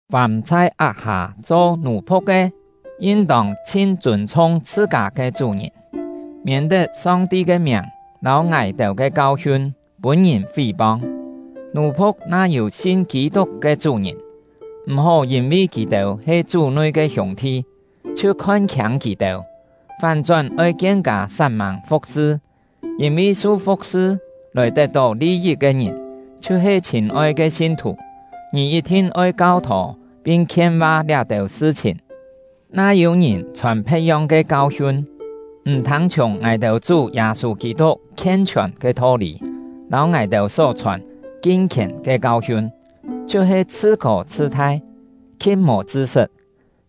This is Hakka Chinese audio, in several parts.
Fàm chhai ak-hâ cho nù-phu̍k ke, yin-tông chhin chûn-chhung chhṳ-kâ ke chú-ngìn, miên-tet Song-ti ke miàng lâu ngài-têu ke kau-hiun pûn-ngìn fí-pong. Nù-phu̍k na yû sin Kî-tuk ke chú-ngìn, m̀-hó yîn-vi kì-têu he Chú nui ke hiûng-thi chhiu khon-khiâng kì-têu; fán-chón oi kien-kâ sat-mâng fu̍k-sṳ, yîn-vi su fu̍k-sṳ lòi tet-tó li-yit ke ngìn chhiu-he chhîn-oi ke sin-thù. Ká Kau-hiun lâu Chṳ̂n Li-yit Ngì yit-thin oi kau-thô pin khien-va liá-têu sṳ-chhìn. Na yû-ngìn chhòn phe̍t-yong ke kau-hiun, m̀ thâng-chhiùng ngài-têu Chú Yâ-sû Kî-tuk khien-chhiòn ke tho-lî lâu ngài-têu só chhòn kin-khièn ke kau-hiun, chhiu-he chhṳ-kô chhṳ-thai, khi̍t mò chṳ-sṳt.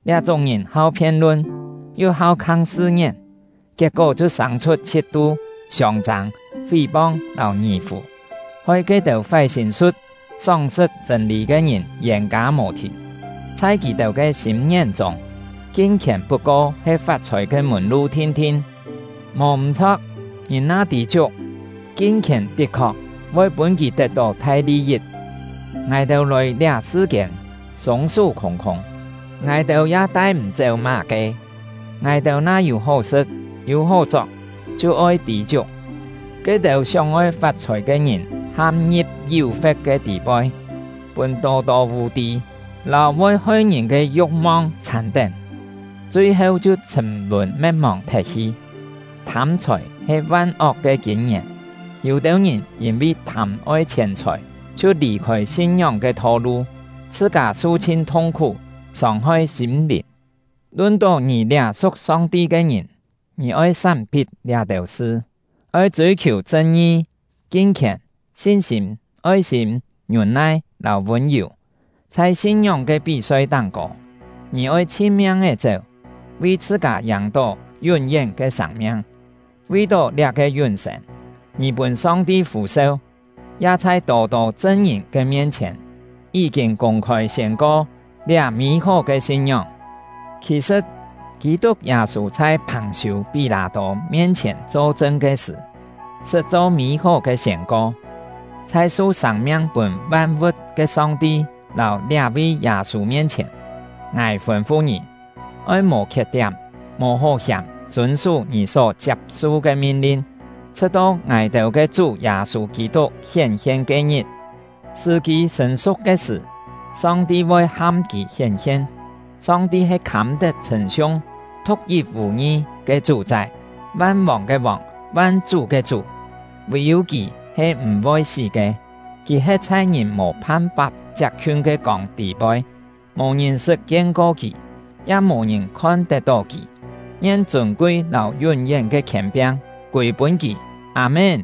Liá-chúng ngìn hau phien-lun, yu hau khang sṳ-ngién; kiet-kó chhiu sâng-chhut chhit-tu, siông-châng, fí-pong, lâu ngì-fù, hoi ke-têu fái sîm-su̍t, sóng-sṳt chṳ̂n-lî ke ngìn yên-kâ mò-thìn. Chhai kì-têu ke sîm-ngién chûng, kin-khièn put-ko he fat-chhòi ke mùn-lu thin-thin! Mò m̀-chho̍k, ngìn na tî-chiuk, kin-khièn tit-khok voi pûn kì tet-tó thai li-yit. Ngài-têu lòi liá sṳ-kiên, sûng-sú khûng-khûng; ngài-têu ya tai-m̀-chéu má-ke! Ngài-têu na yû hó sṳ̍t, yû hó chok, chhiu oi tî-chiuk. Ke-têu sióng-oi fat-chhòi ke ngìn ham-ngi̍p yú-fe̍t ke tî-poi, pûn tô-tô vù-tî lâu voi hoi-ngìn ke yu̍k-mong chhàn-tén, chui-heu chhiu chhṳ̀m-lùn me̍t-mòng thet-hi. Thâm-chhòi he van-ok ke kîn-ngièn. Yû-têu ngìn yîn-vi thâm-oi chhièn-chhòi chhiu lì-khôi sin-ngióng ke tho-lu, chhṳ-kâ su-chhin thung-khú, sông-hoi sîm-lìn. Lun-tó ngì liá su̍k Song-ti ke ngìn, ngì oi sám-phit liá-têu sṳ. Oi chûi-khiù chṳn-ngi, kin-khièn, sin-sîm, oi-sîm, ngiûn-nai, lâu vûn-yù. Chhai sin-ngióng ke pí-soi táng-kô, ngì oi chhin-miang-é chéu, vi chhṳ-kâ yàng-tó yún-yén ke sâng-miang; vi-tó liá-ke yún-sên, ngì pûn Song-ti fû-seu, ya chhai tô-tô chṳn-ngìn ke mien-chhièn, yí-kîn kûng-khôi siên-ko liá mî-hó ke sin-ngióng. Khì-sṳ̍t, Kî-tuk Yâ-sû chhai Phàng-siû-Pí-lâ-tô mien-chhièn cho-chṳn ke sṳ̀, sṳt cho mî-hó ke siên-ko. Chhai su sâng-miang pûn van-vu̍t ke Song-ti lâu liá-vi Yâ-sû mien-chhièn, ngài fûn-fu ngì: Oi mò khiet-tiám, mò hó-hiàm chûn-sú ngì só chiap-su ke min-lin, chhṳ̍t-to ngài-têu ke Chú Yâ-sû Kî-tuk hién-hien ke-ngit. Sṳ̀-kî sṳ̀n-su̍k ke sṳ̀, Song-ti voi ham kì hién-hien; Song-ti he khâm-tet chhṳ̂n-siung, thu̍k-yit vù-ngi ke Chú-chái, van-vòng ke Vòng, van-chú ke Chú. Vì-yû Kì he m̀-voi sí ke. Kì he̍t chhai ngìn mò phan-fap chiap-khiun ke kông tî-poi; mò ngìn sṳt kien-ko Kì, ya mò ngìn khon-tet-tó Kì. Ngien chûn-kui lâu yún-yén ke khièn-piang kûi-pûn Kì! Â-mén.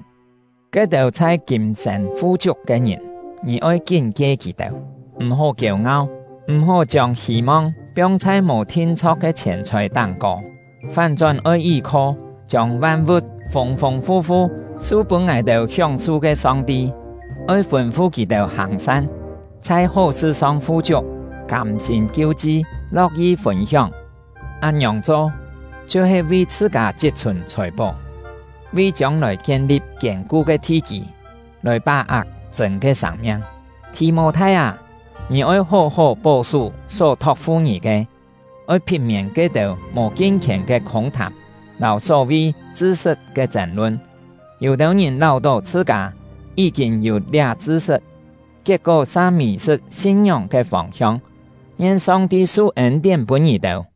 Ke-têu chhai kîm-sên fu-chiuk ke ngìn, ngì oi kín-kie kì-têu: M̀-hó kiêu-ngau; m̀-hó chiông hî-mong piong chhai mò thin-chho̍k ke chhièn-chhòi táng-kô; fán-chón oi yí-kho chiông van-vu̍t fûng-fûng fu-fu su pûn ngài-têu hióng-su ke Song-ti. Oi fûn-fu kì-têu hàng-san, chhai hó-sṳ-song fu-chiuk, kâm-sîm kiu-chi, lo̍k-yi fûn-hióng. Án-ngiòng cho, chhiu-he vi chhṳ-kâ chit-chhùn chhòi-pó, vi chiông-lòi kien-li̍p kiên-ku ke thi-kî, lòi pá-ak chṳ̂n ke sâng-miang. Thì-mô-thai â, ngì oi hó-hó pó-sú só thok-fu ngì ke. Oi phit-miên ke-têu mò kin-khièn ke khûng-thàm, lâu só-vi “chṳ-sṳt” ke chên-lun. Yû-têu ngìn láu-tó chhṳ-kâ yí-kîn yû liá chṳ-sṳt, kiet-kó sa mì-sṳt sin-ngióng ke fông-hiong. Ngien Song-ti su ên-tién pûn ngì-têu!